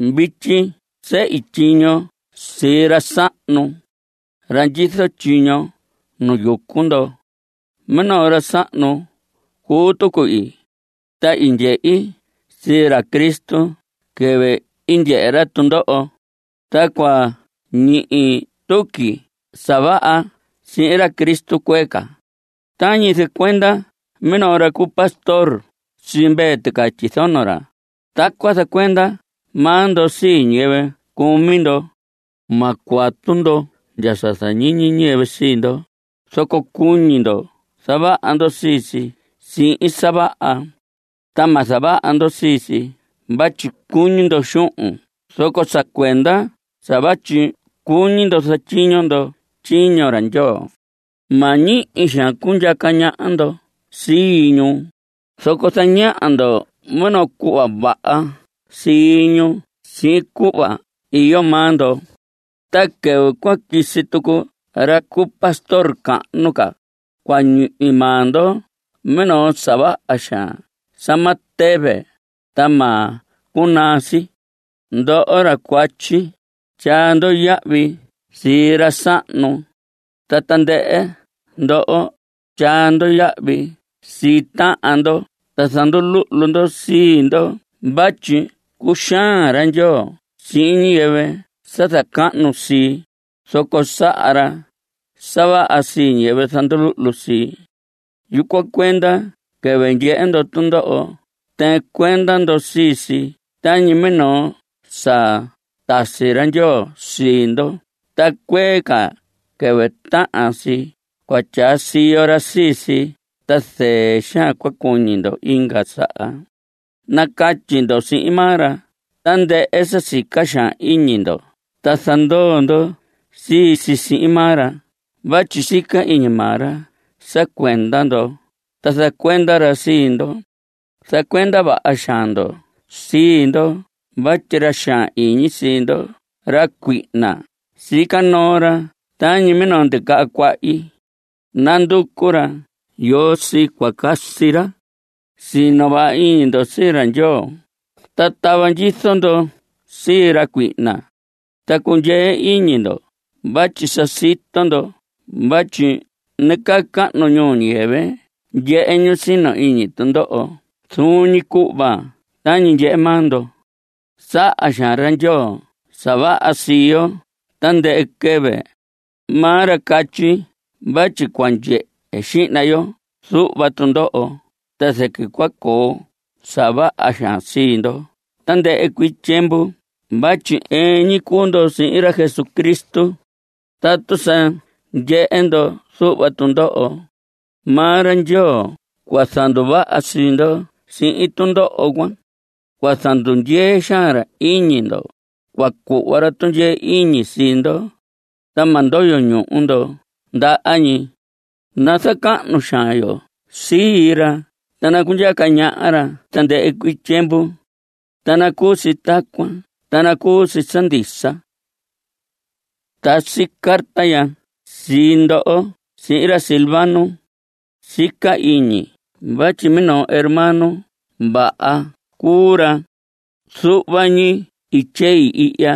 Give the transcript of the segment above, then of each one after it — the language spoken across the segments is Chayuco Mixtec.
Vityi sehi tyiño sii ra sahnu, ra ndyizo tyiño nu yucu ndo. Minoo ra sahnu cuu tucu ii, ta i ndyehi sii ra Cristo quɨvɨ i ndyehe ra tundoho. Ta cua ñihi tuqui sa vaha sihin ra Cristo cuee ca. Tañi zacuenda minoo ra cu pastor sii mvee ticatyi zono ra, tacuan zacuenda maa ndo sii ñiyɨvɨ cumi ndo. Ma cuatu ndo ndya sa zañiñi ñiyɨvɨ sii ndo, zoco cuñi ndo zavaha ndo sii si sihin sa vaha. Ta ma zavaha ndo sii si vatyi cuñi ndo xuhun zoco sa cuenda sa vatyi cuñi ndo zatyiño ndo tyiño ra Ndyoo. Ma ñihi xaan cundyaca ñaha ndo sii ñu, zoco zañaha ndo minoo cuhva vaha sii ñu sihin cuhva vaha iyo maa ndo. Ta quɨvɨ cua quisi tucu ra cu pastor cahnu ca, cua ñihi maa ndo minoo sa vaha xaan sa ma tɨvɨ, ta ma cunaa si. Ndoho ra cuatyi, tyaa ndo yahvi sii ra sahnu. Ta tandɨhɨ ndo, tyaa ndo yahvi sii tahan ndo ta zanduluhlu ndo sii ndo, vatyi: Cuxaan ra Ndyoo sihin ñiyɨvɨ sa zacahnu sii, zoco saha ra sa vaha sii ñiyɨvɨ zanduluhlu sii. Yucuan cuenda quɨvɨ ndyehe ndo tundoho, tɨɨn cuenda ndo sii si tañi minoo sa tasi ra Ndyoo sii ndo, ta cuee ca, quɨvɨ tahan si, cua tyaa siyo ra sii si ta zɨɨ xaan cua cuñi ndo inga saha. Nacatyi ndo sihin maa ra tandɨhɨ sa sica xaan iñi ndo ta zandoo ndo sii si sihin maa ra vatyi sica iñi maa ra sa cuenda ndo, ta zacuenda ra sii ndo. Zacuenda vaha xaan ndo sii ndo vatyi ra xaan iñi sii ndo, ra cuihna, sica noo ra tañi minoo ndicaha cuahyi. Nanducu ra yoo sii cua casi ra. Sino vaha iñi ndo sii ra Ndyoo, ta tava ndyizo ndo sii ra cuihna. Ta cundyee iñi ndo vatyi sa sito ndo vatyi nacahnu ñuu ñiyɨvɨ ndyehe ñu sino iñi tundoho zuun ñi cuhva tañi ndyehe maa ndo. Saha xaan ra Ndyoo sa vaha sii yo tandɨhɨ quɨvɨ. Maa ra catyi vatyi cua ndyehe xihna ndo zuhva tundoho, ta zɨquɨ cua coo sa vaha xaan sii ndo tandɨhɨ cuii tyiemvu vatyi ɨɨn ñi cuu ndo sihin ra Jesucristo. Tatu sa ndyehe ndo zuhva tundoho, maa ra Ndyoo cua zanduvaha sii ndo sihin tundoho cuan. Cua zandundyee xaan ra iñi ndo. Cua cuhva ra tundyee iñi sii ndo, ta ma ndoyo ñuhu ndo ndaha ñi. Nazacahnu xaan yo sii ra, ta nacundyaca ñaha ra tandɨhɨ cuii tyiemvu. Ta nacuu si tacuan ta nacuu si sa ndisa. Tasi carta ya sii ndo sihin ra Silvano. Sica iñi vatyi minoo hermano vaha cuu ra. Zuhva ñi i tyei ihya.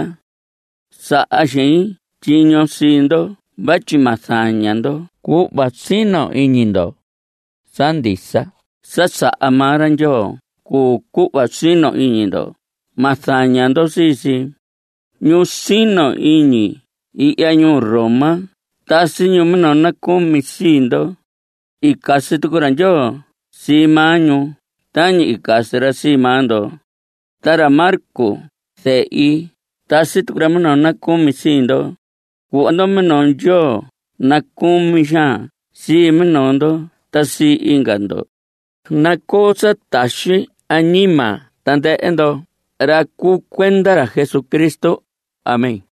Saha xein tyiño sii ndo vatyi ma zaña ndo cuhva sino iñi ndo. Sa ndisa sa saha maa ra Ndyoo cuu cuhva sino iñi ndo; ma zaña ndo sii si. Ñu sino iñi ihya ñuu Roma tasi ñu minoo nacumi sii ndo. I casi tucu ra Ndyoo sii maa ñu tañi i casi ra sii maa ndo. Ta ra Marcos, zehi, tasi tucu ra minoo nacumi sii ndo. Cuhva ndo minoo Ndyoo nacucumi xaan sii minoo ndo ta sii inga ndo. Nacoo sa taxi añima tandɨhɨ ndo, ra cuu cuenda ra Jesucristo. Amén.